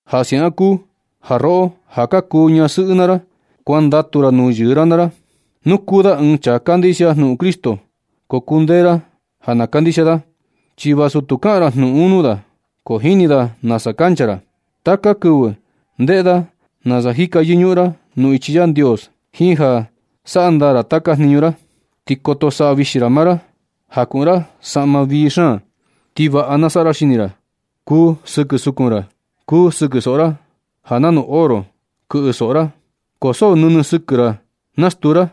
Ja siaꞌan kuu ja roꞌo ja ka kuu ñasɨꞌɨ naa ra, kuandatu ra nuu yɨɨ ra naa ra. Nu kuu da ɨɨn chaa tu kandixia jnuꞌun Cristo, ko kundee ra ja na kandixia da. Chi vasu tu kaꞌan ra jnuꞌun un nuu da, ko jini da nasa kancha ra. Taka kɨvɨ ndeꞌe da nasa jika yɨñuꞌun ra nuu ichi Yandios jiin ja saꞌa ndaa ra taka jniñu ra. Ti koto saꞌa vixi ra maa ra, ja kuꞌun ra saꞌma vii xaan, ti vaꞌa na saꞌa ra xini ra, kuu sɨkɨ sukun ra, kuu sɨkɨ soꞌo ra, ja nanu oro kɨꞌɨ soꞌo ra. Ko so nɨnɨ sɨkɨ ra naskutu ra,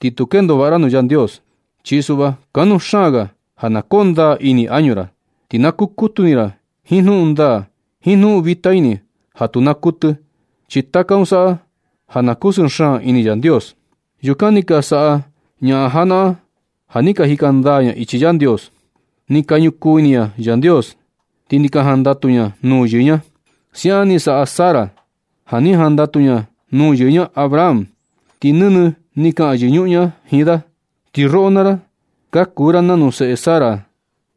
ti tu kendo vaꞌa ra nuu Yandios. Chi suꞌva, kanuu xaan ga ja na koo ndaa ini añu ra. Ti na kukutu ini ra jiin jnuꞌun ndaa, jiin jnuꞌun vita ini ja tu naa kuɨtɨ. Chi taka un saꞌa ja na kusɨɨ xaan ini Yandios. Yukan ni ka saꞌa ñaꞌan janaꞌan ja ni ka jika ndaa ña ichi Yandios. Ni ka ñukuu ini ña Yandios, ti ni ka jandatu ña nuu yɨɨ ña. Siaꞌan ni saꞌa Sara ja ni jandatu ña nuu yɨɨ ña Abraham, ti nɨnɨ ni kaꞌan yɨñuꞌun ña jiin da. Ti roꞌo naa ra, ka kuu ra nanu seꞌe Sara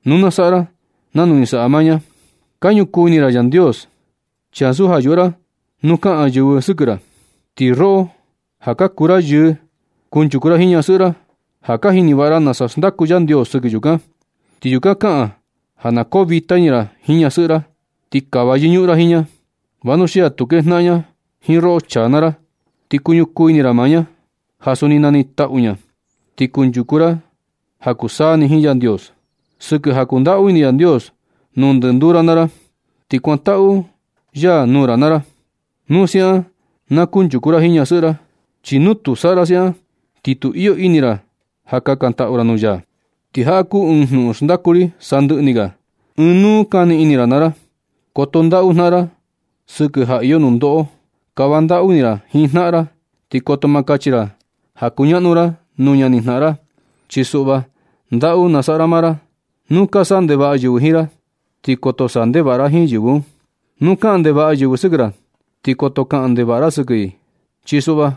nu na saꞌa ra nanu ni saꞌa maa ña, ka ñukuu ini ra Yandios, ti ansu ja yuꞌu ra nu ka kaꞌan yɨvɨ sɨkɨ ra. Ti roꞌo ja ka kuu ra yɨɨ, kanchuku ra jiin ñasɨꞌɨ ra, ja ka jini vaꞌa ra nasa xndaku Yandios sɨkɨ yukan. Ti yukan kaꞌan ja na koo vita ini ra jiin ñasɨꞌɨ ra. Ti kava yɨñuꞌun ra jiin ña, vanuxia tu kejnaꞌan ña jiin roꞌo chaa naa ra. Ti kuñukuu ini ra maa ña, ja suni nanitaꞌu ña ti kunchuku ra ja kuu saa ni jiin Yandios, sɨkɨ ja kundaꞌu ini Yandios nuu ndɨnduu ra naa ra. Ti kuantaꞌu ya nuu ra naa ra. Nu siaꞌan na kunchuku ra jiin ñasɨꞌɨ ra, chi nu tu saꞌa ra siaꞌan ti tu iyo ini ra ja kakantaꞌu ra nuu ya. Ti jaꞌa kuu ɨɨn jnuꞌun xnadaku ri sandɨꞌɨ ni ga. Unuu kani ini ra naa ra. Koto ndaꞌu jnaꞌan ra sɨkɨ ja iyo nundoꞌo. Kava ndaꞌu ini ra jiin jnaꞌan ra. Ti koto kachi ra ja kuñaꞌnu ra nuu ñani jnaꞌan ra, chi suꞌva ndaꞌu na saꞌa ra maa ra. Nu ka saꞌa ndevaꞌa yɨvɨ jiin ra, ti koto saꞌa ndevaꞌa ra jiin yɨvɨ un. Nu kaꞌan ndevaꞌa yɨvɨ sɨkɨ ra, ti koto kaꞌan ndevaꞌa ra sɨkɨ i. Chi suꞌva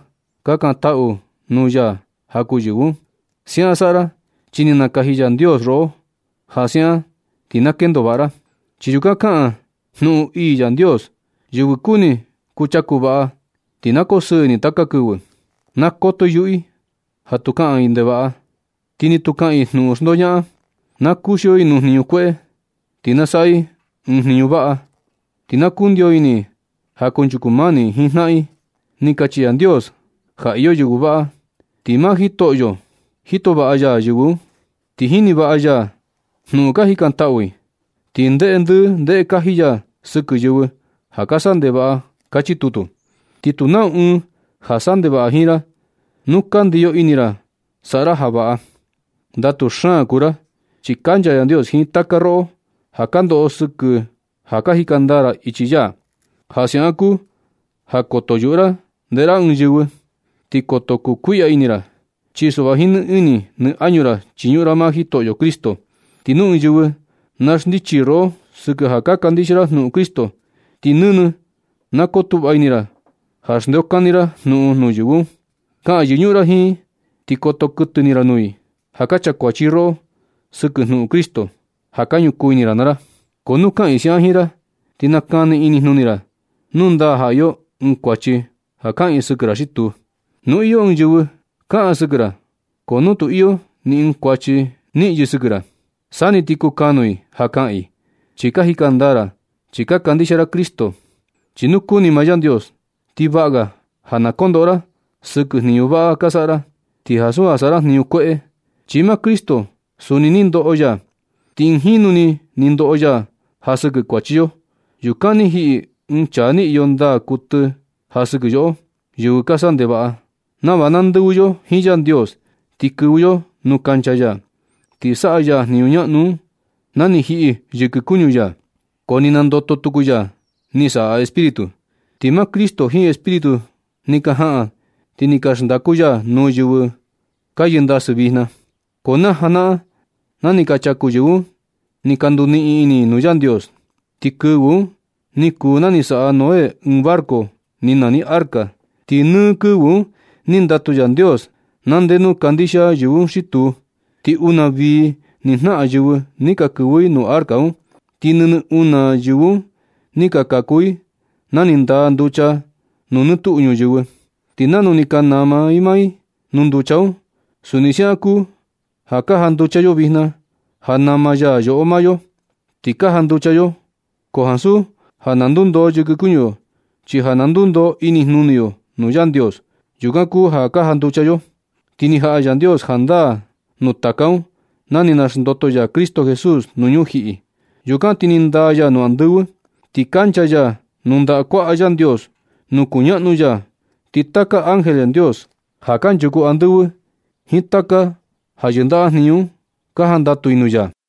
kakantaꞌu nuu ya ja kuu yɨvɨ un. Siaꞌan saꞌa ra, chi ni nakaji Yandios roꞌo ja siaꞌan ti na kendo vaꞌa ra. Chi yukan kaꞌan jnuꞌun ii Yandios: Yɨvɨ kuni kuchaku vaꞌa ti na koo sɨɨ ini taka kɨvɨ. Na koto i yuꞌu i ja tu kaꞌan ndevaꞌa, ti ni tu kaꞌan i jnuꞌun xndoñaꞌan. Na kuxio i nuu jniñu kueꞌe, ti na saꞌa i ɨɨn jniñu vaꞌa. Ti na kundio ini i ja kunchuku mani i jiin jnaꞌan i. Ni kachi Yandios ja iyo yɨvɨ vaꞌa, ti maa Jitoꞌo jito vaꞌa ya yɨvɨ un. Ti jini vaꞌa ya jnuꞌun ka jikantaꞌu i. Ti ndeꞌe ndɨɨ ndeꞌe kaji ya sɨkɨ yɨvɨ ja ka saꞌa ndevaꞌa. Kachi tutu. Ti tu nau ɨɨn ja saꞌa ndevaꞌa jiin ra nu ka ndiyo ini ra saꞌa ra ja vaꞌa. Ndatu xaan kuu ra, chi kancha Yandios jiin taka roꞌo ja ka ndoꞌo sɨkɨ ja ka jika ndaa ra ichi ya. Ja siaꞌan kuu ja koto yuꞌu ra ndeꞌe ra ɨɨn yɨvɨ, ti koto kukuiꞌya ini ra. Chi suꞌva jiin nɨ ini nɨ añu ra chiñuꞌun ra maa Jitoꞌo Cristo. Ti nu ɨɨn yɨvɨ na xndichi i roꞌo sɨkɨ ja ka kandixia ra jnuꞌun Cristo, ti nɨnɨ na kotuꞌva ini ra ja xndeokani ra jnuꞌun nuu yɨvɨ un. Kaꞌan yɨñuꞌun ra jiin i, ti koto kuɨtɨ ini ra nuu i ja ka chakuachi i roꞌo sɨkɨ jnuꞌun Cristo, ja ka ñukuu ini ra naa ra. Ko nu kaꞌan i siaꞌan jiin ra, ti nakani inijnuni ra nu ndaa ja iyo ɨɨn kuachi ja kaꞌan i sɨkɨ ra xi tuu. Nu iyo ɨɨn yɨvɨ kaꞌan sɨkɨ ra, ko nu tu iyo ni ɨɨn kuachi niꞌin yɨ sɨkɨ ra, sa ni ti kukanuu i ja kaꞌan i, chi ka jika ndaa ra, ti ka kandixia ra Cristo. Chi nu kuni maa Yandios, ti vaꞌa ga ja na kondoꞌo ra sɨkɨ jñinu vaꞌa ka saꞌa ra, ti ansu ja saꞌa ra jñinu kueꞌe. Chi maa Cristo suni ni ndoꞌo ya, ti ɨɨn jinu ni ni ndoꞌo ya ja sɨkɨ kuachi yo. Yukan ni jiꞌi ɨɨn chaa ni iyo ndaa kuɨtɨ ja sɨkɨ yoꞌo, yɨvɨ ka saꞌa ndevaꞌa, nava na ndɨvɨ yo jiin Yandios ti kɨvɨ yo nuu kancha ya. Ni saꞌa ya jñinu ñaꞌnu un na ni jiꞌi yɨkɨ kuñu ya, ko ni nandoto tuku ya ni saꞌa Espíritu. Ti maa Cristo jiin Espíritu un ni ka jaꞌan ti ni ka xndaku ya nuu yɨvɨ ka yɨndasɨ vijna. Ko na janaꞌan na ni ka chaku yɨvɨ un ni ka nduniꞌin ini i nuu Yandios. Ti kɨvɨ un ni kuu na ni saꞌa Noé ɨɨn barco ni nani arca. Ti nɨ kɨvɨ un ni ndatu Yandios na nde nu kandixia yɨvɨ un xi tuu. Ti una vii ni jnaꞌan yɨvɨ ni ka kɨvɨ i nuu arca un. Ti nɨnɨ una yɨvɨ un ni ka kaku i na ni ndaa nducha nuu nɨ tuꞌu ñuyɨvɨ. Ti nanu ni ka nama i maa i nuu nducha un, suni siaꞌan kuu ja ka janducha yo vijna ja nama yo maa yo. Ti ka janducha yo, ko ansu ja na ndundoo yɨkɨ kuñu yo, chi ja na ndundoo inijnuni yo nuu Yandios. Yukan kuu ja ka janducha yo. Ti ni jaꞌa Yandios jandaa nuu taka un na ni xndoto ya Cristo Jesús nuu ñujiꞌi. Yukan ti ni ndaa ya nuu andɨvɨ, ti kancha ya nuu ndaꞌa kuaꞌa Yandios nuu kuñaꞌnu ya. Ti taka ángel Yandios ja kanchuku andɨvɨ, jiin taka ja yɨndaꞌa jñinu un, ka jandatu i nuu ya.